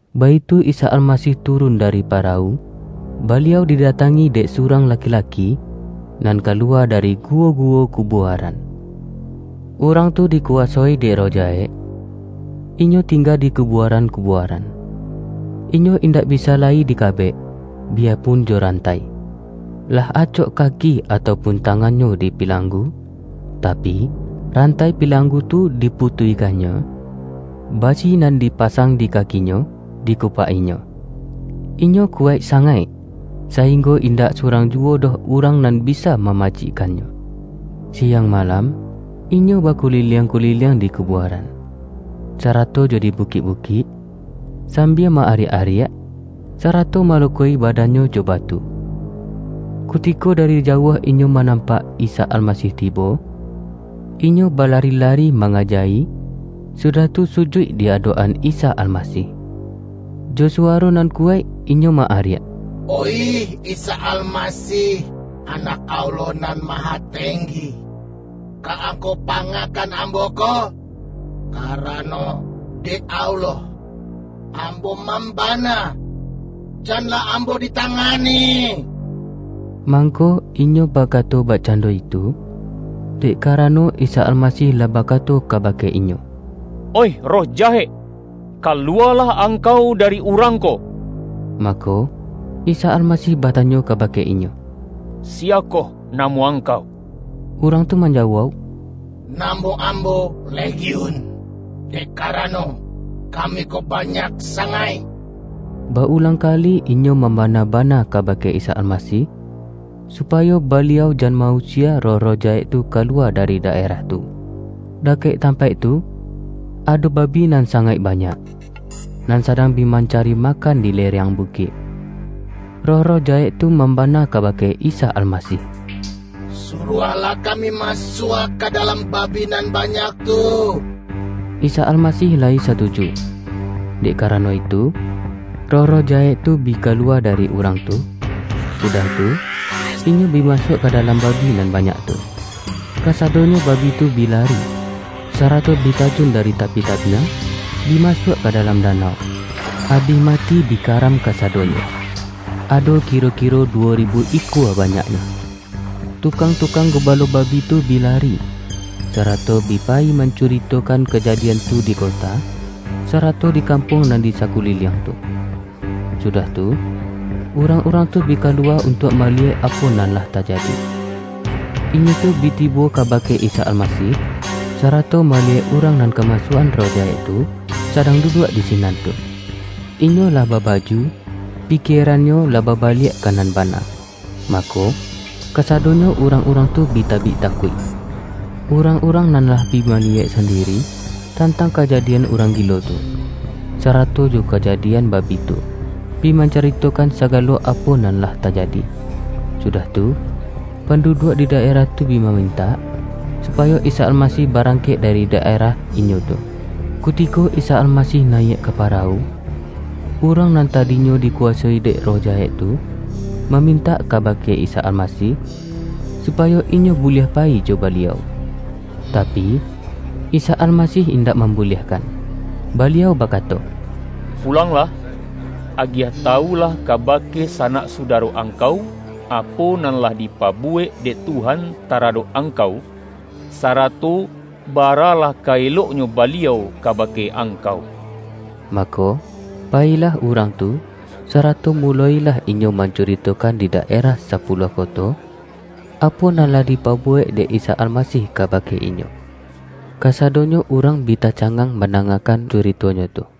Baitu Isa Almasih turun dari para-wu, Baliau didatangi dek surang la-ki-laki, nan kaluwa dari guwo-guwo kubuaran. Urang tu dikuwasoi dek roh jahek, inyo tingga di kubuaran-kubuaran. Inyo indak bisa lai dika-bek; biyapun jo rantai. Lah acok kaki atau pun tangannyo dipilanggu, tapi, rantai pilanggu tu diputuihkannyo, basi nan dipasang di kakinyo diku-pak-inyo. Inyo kuwaik sangaik, sainggo indak surang juwo doh urang nan bisa mamacikkannyo. Siang malam inyo bakuliliang-kuliliang di kubua-ran, sarato jo di bukik-bukik, sambia ma-ariak-ariak, sarato malukoi ba-dannyo jo batu. Kutiko dari jauah inyo manampak Isa Almasih tibo, inyo balari-lari ma-ngaja-i, sudah tu sujuik di adok-an Isa Almasih. Jo suwaro nan kuwaik inyo ma-ariak,”Oih Isa Almasih, Anak Allah Nan Mahatenggi! Ka Angkau panga-kan ambo ko? Karano dek Allah, am-bo mambana, janlah ambo ditangani!” ( Mangko inyo bakato bakcando itu, dek karano Isa Almasih lah bakato ka-bake inyo,”Oih roh jahek, kaluwalah angkau dari urang ko!”) Mako, Isa Almasih batanyo kabake inyo,”Siyakoh namo angkau?” Urang tu manjawauk,”Namo ambo ’Legiun' —dek karano, kami ko banyak sangaik!” Ba-ulang kali inyo mam-bana-bana kabake Isa Almasih, supa-yo Baliau jan ma-usie roh-roh jahek tu kaluwa dari daerah tu. Dakek tampaik tu, ado babi nan sangaik banyak, nan sadang bi man-cari makan di lereang bukik. Roh-roh jahek tu mambana kabake Isa Almasih,”Suruahlah kami masuak ka dalam babi nan banyak tu.” Isa Almasih layi satuju. Dek karano itu, roh-roh jahek tu bi kaluwa dari urang tu, su-dah tu, inyo bi masuak ka dalam babi nan banyak tu. Kasadonyo babi tu bi lari, sarato bi tajun dari tapi tabiang, bi masuak ka dalam danau, abih ma-ti bi karam -- kasadonyo ado kiro-ki-ro duwo ribu ikua banyaknyo. Tukang-tukang gubalo babi tu bi lari, sarato bi payi mancuritokan ka-jadian tu di kota, sarato di kampuang nan di sakuliliang tu. Sudah tu, urang-urang tu bi kaluwa untuak maliyek apo nan lah tajadi. Inyo tu bi tibo kaba-ke Isa Almasih, sarato maliyek urang nan kamasuak-an roh jahek tu, sadang duduak di sinan tu. Inyo lah babaju, pikierannyo lah babaliak ka nan bana. Mako, kasadonyo urang-urang tu bi tabik takuik. Urang-urang nan lah bi maliyek sandiri, tantang kaja-dian urang gilo tu, sarato jo kajadi-an babi tu, bi mancuritokan sagalo apo nan lah tajadi. Sudah tu, pan-duduak di daerah tu bi mamintak, su-payo Isa Almasih barangkek dari da-erah inyo tu. Kutiko Isa Almasih nayiak ka pa-rawu, urang nan tadinyo dikuwasoi dek roh jahek tu, mamintak kabake Isa Almasih, supayo inyo buliah pa-yi jo Baliau. Tapi, Isa Almasih indak mambu-liahkan, Baliau bakato,”Pulanglah, agiah tawulah kabake sanak sudaro angkau, apo nan lah dipabuwek dek Tuhan taradok angkau, sarato baralah ka eloknyo Baliau kabake angkau!” Mako, payilah urang tu, sarato muloilah inyo mancuritokan di da-erah Sapuluah Koto, apo nan lah di-pabuwek dek Isa Almasih kabake inyo. Kasadonyo urang bi tacangang man-dangakan curitonyo tu.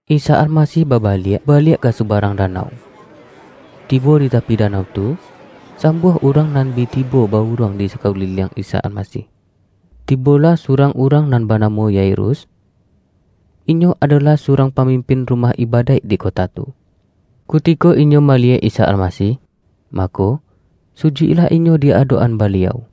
Isa Almasih babaliak baliak ka su-barang danau. Tibo di tapi danau tu, sambuah urang nan bi tibo ba-uruang di sakuliliang Isa Almasih. Tibolah surang urang nan banamo Yairus. Inyo adolah surang pamimpin rumah iba-daik di kota tu. Kutiko inyo maliyek Isa Almasih, mako, sujuiklah inyo di adok-an Baliau,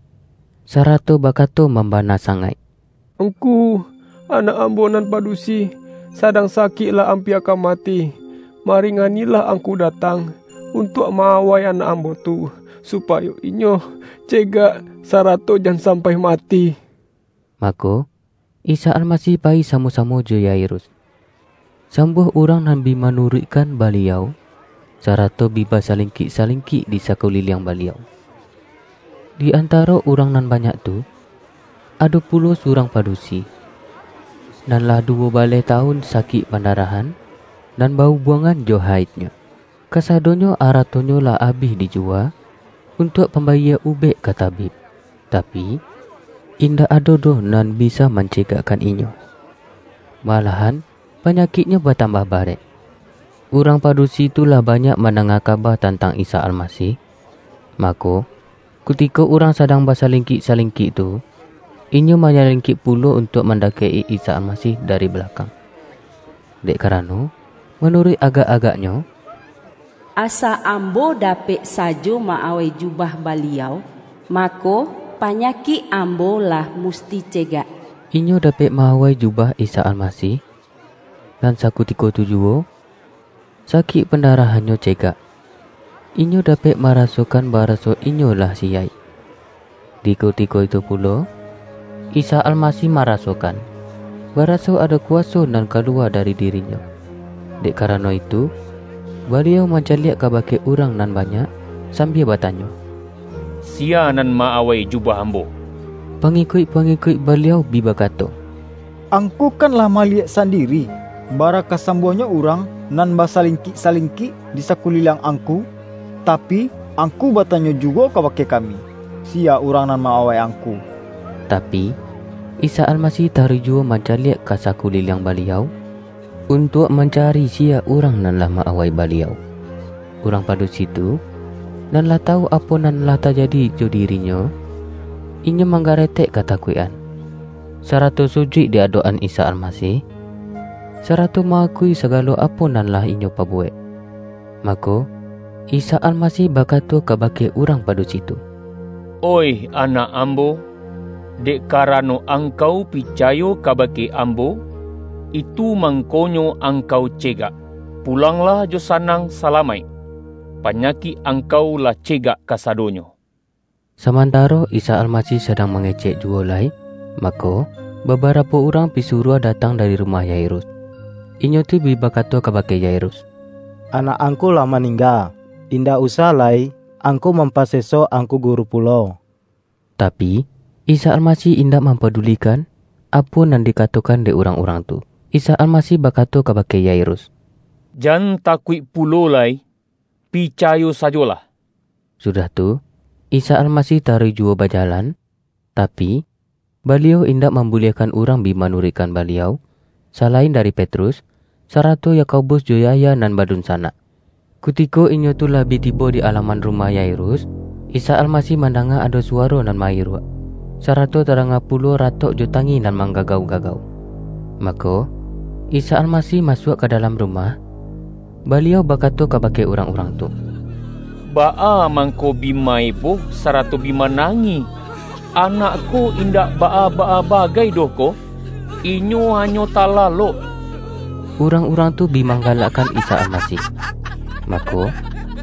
sarato bakato mam-bana sangaik,”Ngku, anak ambo nan padusi, sadang sakik lah ampia ka ma-ti. Maringanilah Angku datang, untuak ma-awai anak ambo tu, supayo inyo cegak, sarato jan sampai mati!” Mako, Isa Almasih payi samo-samo jo Yairus. Sambuah urang nan bi manu-ruikkan Baliau, sarato bi basalingkik-salingkik di sakuliliang Baliau. Di antaro urang nan banyak tu, ado pulo surang padusi, nan lah duwo baleh tawun sakik pandarahan, nan ba-ubuangan jo haidnyo. Kasadoyo aratonyo lah abih dijuwa, untuak pam-bayie ubek ka tabib, tapi, indak ado doh nan bisa mancegakkan inyo, ma-lahan panyakiknyo batambah barek. Urang padusi tu lah banyak man-danga kaba tantang Isa Almasih. Ma-ko, kutiko urang sadang basalingkik-salingkik tu, inyo manyalingkik pulo untuak mandakek-i Isa Almasih dari balakang, dek karano, manuruik agak-agaknyo,”Asa ambo dapek sajo ma-awai jubah Baliau, mako, panya-kik ambo lah musti cegak!” Inyo dapek ma-awai jubah Isa Almasih, nan sakutiko tu juwo, sa-kik pandarahannyo cegak. Inyo dapek marasokan baraso inyo lah siyaik. Di kutiko itu pulo, Isa Almasih ma-rasokan, baraso ado kuwaso nan ka-luwa dari diri-Nyo. Dek karano itu, Baliau mancaliak kabake urang nan banyak, sambia batanyo,”Siya nan ma-awai jubah Ambo?” Pangikuik-pangikuik Baliau bi ba-kato,”Angku kan lah maliyek sandi-ri, bara ka sambuahnyo urang nan basalingkik-salingkik di sakuliliang Angku. Tapi, Angku batanyo juwo ka-bake kami, siya urang nan ma-awai Angku?” Tapi, Isa Almasih taruih juwo man-caliak ka sakuliliang Baliau, untuak mancari siya urang nan lah ma-awai Baliau. Urang padusi tu, nan lah ta-wu apo nan lah tajadi jo dirinyo, inyo manggaretek katakuik-an, sarato su-juik di adok-an Isa Almasih, sarato ma-akui sagalo apo nan lah inyo pa-buwek. Mako, Isa Almasih bakato kabake urang padusi tu,”Oih anak Ambo, dek karano angkau picayo kaba-ke Ambo, itu mangkonyo angkau cegak! Pulanglah jo sanang salamaik. Panya-kik angkau lah cegak kasadonyo!” samantaro Isa Almasih sadang ma-ngecek juwo lai, mako, babarapo urang pisuruah datang dari rumah Yairus. Inyo tu bi bakato kabake Yairus.”Anak angku lah maningga, indak usah lai angku mampaseso Angku Guru pulo.” Tapi, Isa Almasih indak mampa-dulikan, apo nan dikatokan dek urang-urang tu, Isa Almasih bakato kabake Yairus,”Jan takuik pulo lai, picayo sa-jolah!” sudah tu, Isa Almasih taruih juwo bajalan, tapi, Baliau indak mambu-liahkan urang bi manuruikkan Baliau, salain dari Petrus, sarato Yakobus jo Yahya nan badunsanak. Kutiko inyo tu lah bi tibo di alaman rumah Yairus, Isa Almasih mandanga ado suwaro nan ma-iruak, sarato tadanga pulo ratok jo tangih nan manggagau-gagau. Mako, Isa Almasih masuak ka dalam rumah, Baliau bakato kabake urang-urang tu,”Baa mangko bi ma-eboh, sarato bi ma-nangih? Anak ko indak baa-baa bagai doh ko; inyo hanyo talalok!” Urang-urang tu bi manggalakkan Isa Almasih. Mako,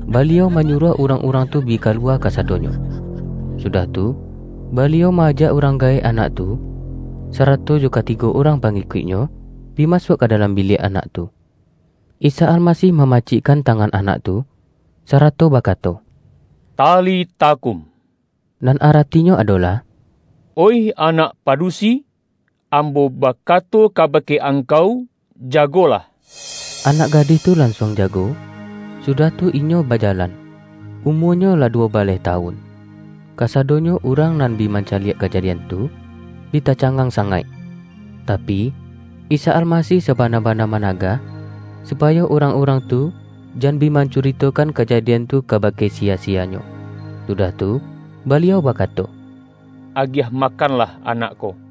Baliau manyuruah urang-urang tu bi kaluwa kasadonyo. Sudah tu, Baliau ma-ajak urang gaek anak tu, sarato jo katigo urang pangi-kuik-Nyo, bi masuak ka dalam biliak anak tu. Isa Almasih mamacikkan tangan anak tu, sarato bakato,”Talita kum,” nan aratinyo adolah,”Oih anak padusi, Ambo bakato kabake angkau: jagolah!” Anak gadih tu lansuang jago, su-dah tu inyo bajalan. (Umuanyo lah du-wo baleh tawun.) Kasadonyo urang nan bi mancaliak kajadian tu, bi tacangang sangaik! Tapi, Isa Almasih sabana-bana managah, supayo urang-urang tu, jan bi mancuritokan kajadian tu kaba-ke siya-siyanyo. Sudah tu, Baliau baka-to,”Agiah makanlah anak ko.”